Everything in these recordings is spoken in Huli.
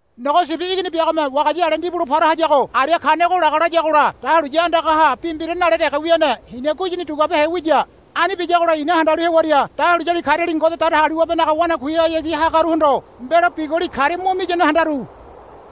Nogo Sibi Igini biagome wagaya ale ndibulo para hayago aria kanego laga layagola dahuliya andagaha bi mbira nale dege wiane hina guyini duguabehe wiya. Ani biyagola i̱na handalu hewaria dahuliyali kariali Ngode Datagaliwabenaga wanakuihayagi hagaruhondo mbelo biguli karia mo miyane handaru.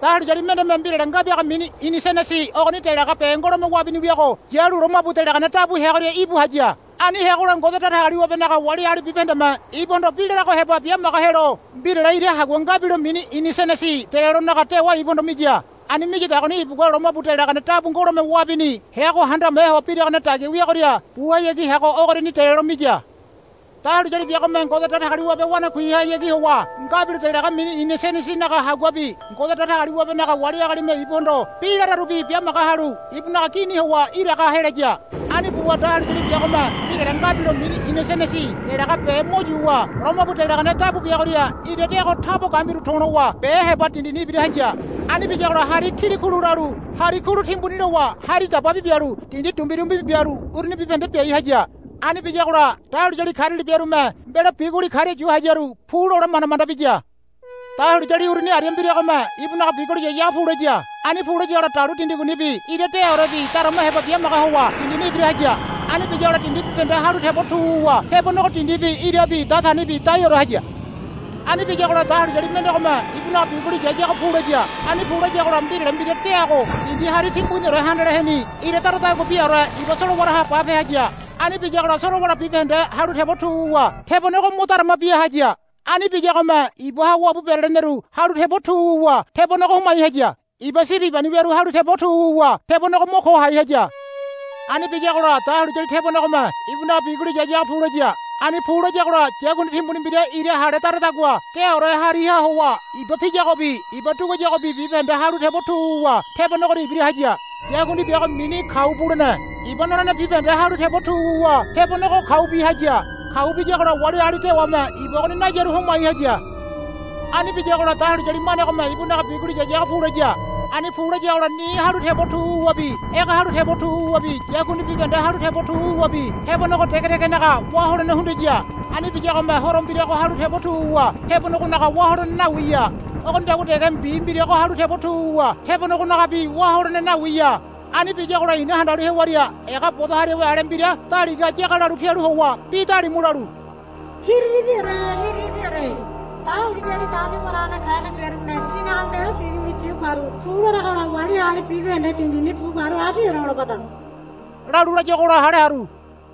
Dahuliyali mendeme mbirale nga biaga mini inisenesi ogoni delaga be ngolome wabini wiago yalu lomabu delagane dabu heagoria íbu haya. Ani heagola Ngode Datagaliwabenaga wali agali bibahendeme ibuhondo bi larago heba biamaga helo mbirale ira hagua ngabilo mini inisenesi delelonaga dewa ibuhondo miya. Ani miyadagoni ibugua lomabu delagane dabu ngolome wabini heago handame ho biragane dagia wiagoria buhayagi heago ogoriani delelo miya. Dahuliyali biagome Ngode Datagaliwabe wanakuihayagi howa ngabilo delaga mini inisenesinaga haguabi Ngode Datagaliwabenaga wali agalime ibuhondo bi lararubi biamaga halu ibunaga gini howa iraga helaya. Ani buwa dahuliyali biagome mbirale ngabilo mini inisenesi delaga be mo yuwa lomabu delagane dabu biagoria ira deago tabo gambiru to̱lowa be heba dindini ibira haya. Ani biyagola hari kilikulu lalu hari kulu timbuni lowa hari dababi bialu dindi dumbirumbibi bialu uruni bibahende biai haya. Ani biyagola dahuliyali kariali biarume mbelo biguli karia yu hayaru pu lole manda manda biya. Dahuliyali uruni aria mbiragome ibunaga biguli yayago pulaya. Ani pu layagola dalu dindi gunibi ira deaorebi darama heba bimaga howa dindini ibira haya. Ani biyagola dindi bibahende halu tebo tu wuwa tebonego dindibi irabi datanibi daiore haya. Ani biyagola dahuliyali mendegome ibunaga biguli yayago pulaya. Ani pu layagola mbirale mbira deago dindi hari timbuniore handaleheni ira daradagua biaore iba solowaraha bape haya. Ani biyagola solowara bibahende halu tebo tu wuwa tebonego mo darama bia haya. Ani biyagome ibaha wabu bereleneru halu tebo tu wuwa tebonego homai haya. Iba sibi ibani wiaru halu tebo tu wuwa tebonego mo ko hai haya. Ani biyagola dahuliyali tebonegome ibunaga biguli yayago pulaya. Ani pu layagola yakundi timbuni mbira ira hale daradagua deaore hariha howa iba piyagobi iba duguayagobi bibahende halu tebo tu wuwa tebonegoria ibira haya. Yakundi biago mini Kau Bulene. Iba nolene bibahende halu tebo tu wuwa tebonego kaubi haya. Kau biyagola wali agali dewame iba ogoni nayaru homai haya. Ani biyagola dahuliyali manegome ibunaga biguli yayago pulaya. Ani pu layagola ni halu tebo tu wuwabi ege halu tebo tu wuwabi yakundi bibahende halu tebo tu wuwabi tebonego dege degenaga wá holene hundiya. Ani biyagome horo mbirago halu tebo tu wuwa tebonegonaga wá holene nawiya. Ogonidagua dege mbi mbirago halu tebo tu wuwa tebonegonagabi wá holene nawiya. Ani biyagola i̱na handalu hewaria ega bodo hariawe ale mbira daligaha yagalalu pialu howa bi dalimu lalu, Hiriribiore hiriribiore. Dahuliyali dauni waragane kane biarume tinaga mbelo biguli yu karu pu laragola wali agali bibahende dindini bu karu abiore holobada, lalu layuagola hale haru.